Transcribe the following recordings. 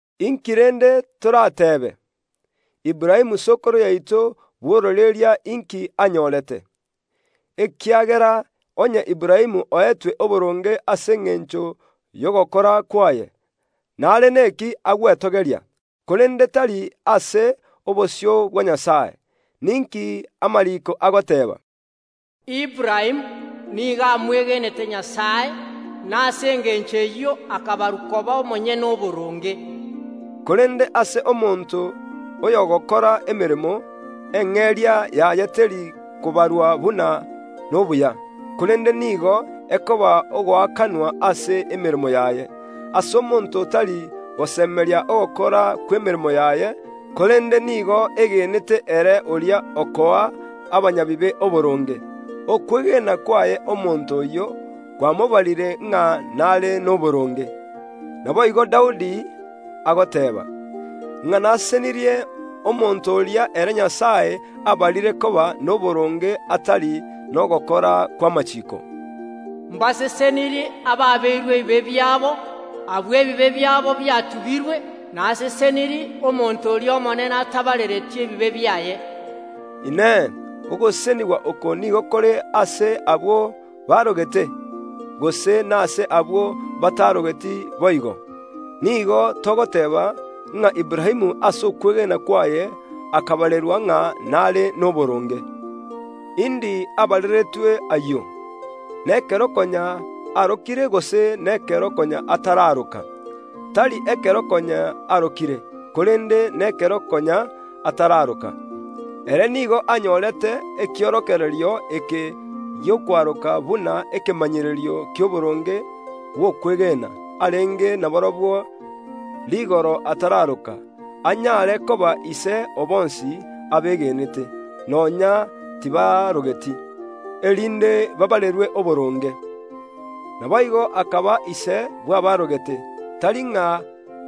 Inki rende toratebe? Aburaamu sokoro yaito bw’ororeria inki anyorete? Ekiagera onye Aburaamu oetwe oboronge ase engencho y’ogokora kwaye, nare neki agwetogeria, korende tari ase obosio bwa Nyasae. Ninki amariiko agoteeba? “Aburaamu nigo amwegenete Nyasae, na ase engencho eyio akabarerwa oboronge.” Korende ase omonto oy’ogokora emeremo, eng’eria yaye teri kobarwa buna nobuya, korende nigo ekoba ogoakanwa ase emeremo yaye. Ase omonto otari gosemeria ogokora kw’emeremo yaye, korende nigo egenete ere oria okoa abanyabibe oboronge, okwegena kwaye omonto oyio kwamobarire ng’a n’are noboronge. Naboigo Daudi agoteeba, ng’a nasesenirie omonto oria ere Nyasae abarire koba noboronge atari nogokora kw’amachiiko, “Mbasesenirie abaabeirwe ebibe biabo, abwo ebibe biabo biatubirwe. Nasesenirie omonto ori’Omonene atabarereti ebibe biaye.” Inee! Ogosesenigwa oko nigo kore ase abwo baarogete, gose nase abwo batarogeti boigo? Nigo togoteeba, ng’a Aburaamu ase okwegena kwaye akabarerwa ng’a nare noboronge. Indi abareretwe ayio? Nekero konya arokire gose nekero konya ataraaroka? Tari ekero konya arokire, korende nekero konya ataraaroka. Ere nigo anyorete ekiorokererio eke gi’okwaroka buna ekemanyererio ki’oboronge bw’okwegena arenge naborobwo rigoro ataraaroka, anyare koba ise o bonsi abegenete, nonya tibaarogeti, erinde baabarerwe oboronge. Naboigo akaba ise bw’abaarogete, tari ng’a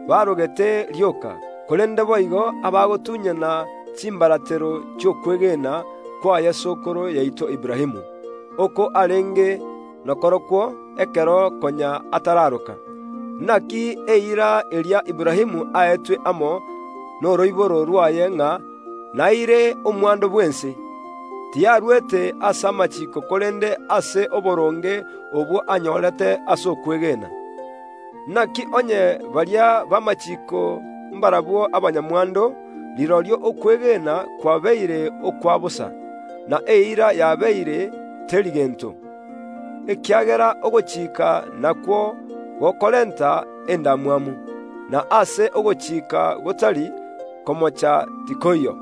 baarogete rioka, korende boigo abagotunyana chimbaratero chi’okwegena kwaye sokoro yaito Aburaamu, oko arenge nakorokwo ekero konya ataraaroka. Inaki eira eria Aburaamu aetwe amo noroiboro rw’aye ng’a naire omwando bw’ense, tiyarwete ase amachiiko korende ase oboronge obwo anyorete ase okwegena. Inaki onye baria b’amachiiko mbarabwo abanyamwando, rirorio okwegena kwabeire okwa bosa, na eira yabeire teri gento. Ekiagera ogochika nakwo gokorenta endamwamu; na aase ogochika gotari, komocha tikoiyo.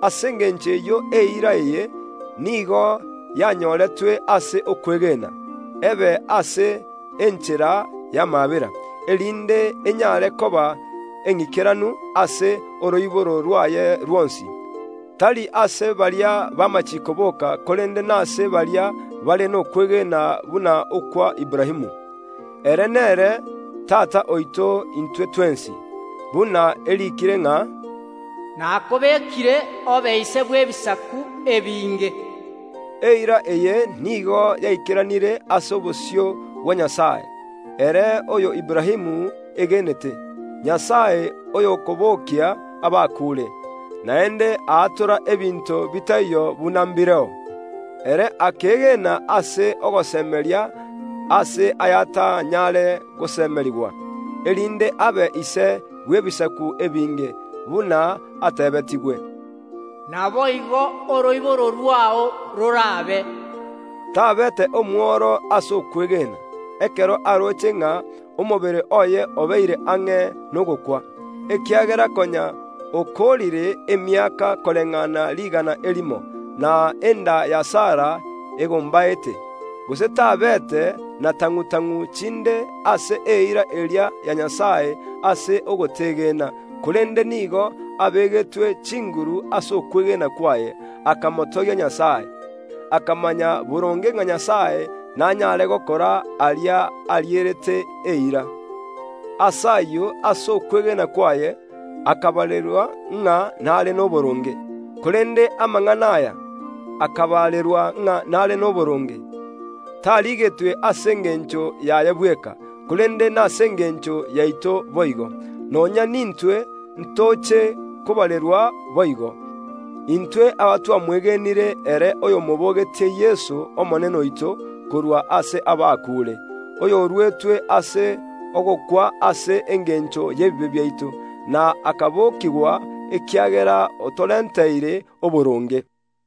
Ase engencho eyio eira eye nigo yanyoretwe ase okwegena, ebe ase enchera y’amaabera, erinde enyare koba eng’ikeranu ase oroiboro rwaye rwonsi, tari ase baria b’amachiiko boka korende nase baria bare nokwegena buna okwa Aburaamu. Ere nere tata oito intwe twensi, buna eriikire ng’a, “Nakobekire obe ise bw’ebisaku ebinge”. Eira eye nigo yaikeranire ase obosio bwa Nyasae, ere oyo Aburaamu egenete, Nyasae oyokobokia abakuure, naende bwatora ebinto bitaiyo buna mbireo. Ere akeegena ase ogosemeria ase ay’atanyare gosemerigwa, erinde abe ise bw’ebisaku ebinge, buna ateebetigwe, “Naboigo oroiboro rwao rorabe.” Tabeete omworo ase okwegena, ekero aroche ng’a omobere oye obeire ang’e nogokwa, ekiagera konya okoorire emiaka koreng’ana rigana erimo, na enda ya Sara egombaete; gose tabeete na tang’u‐tang’u chinde ase eira eria ya Nyasae ase ogotegena, korende nigo abegetwe chinguru ase okwegena kwaye, akamotogia Nyasae. Akamanya boronge ng’a Nyasae nanyare gokora aria arierete eira. Ase ayio ase okwegena kwaye “akabarerwa ng’a nare noboronge.” Korende amang’ana aya “akabarerwa ng’a nare noboronge” tarigetwe ase engencho yaye bweka, korende nase engencho yaito boigo. Nonya nintwe ntoche kobarerwa boigo, intwe abatwamwegenire ere oyomobogetie Yeso, Omonene oito, korwa ase abakuure, oyoruetwe ase ogokwa ase engencho y’ebibe biaito, na akabokigwa ekiagera otorenteire oboronge.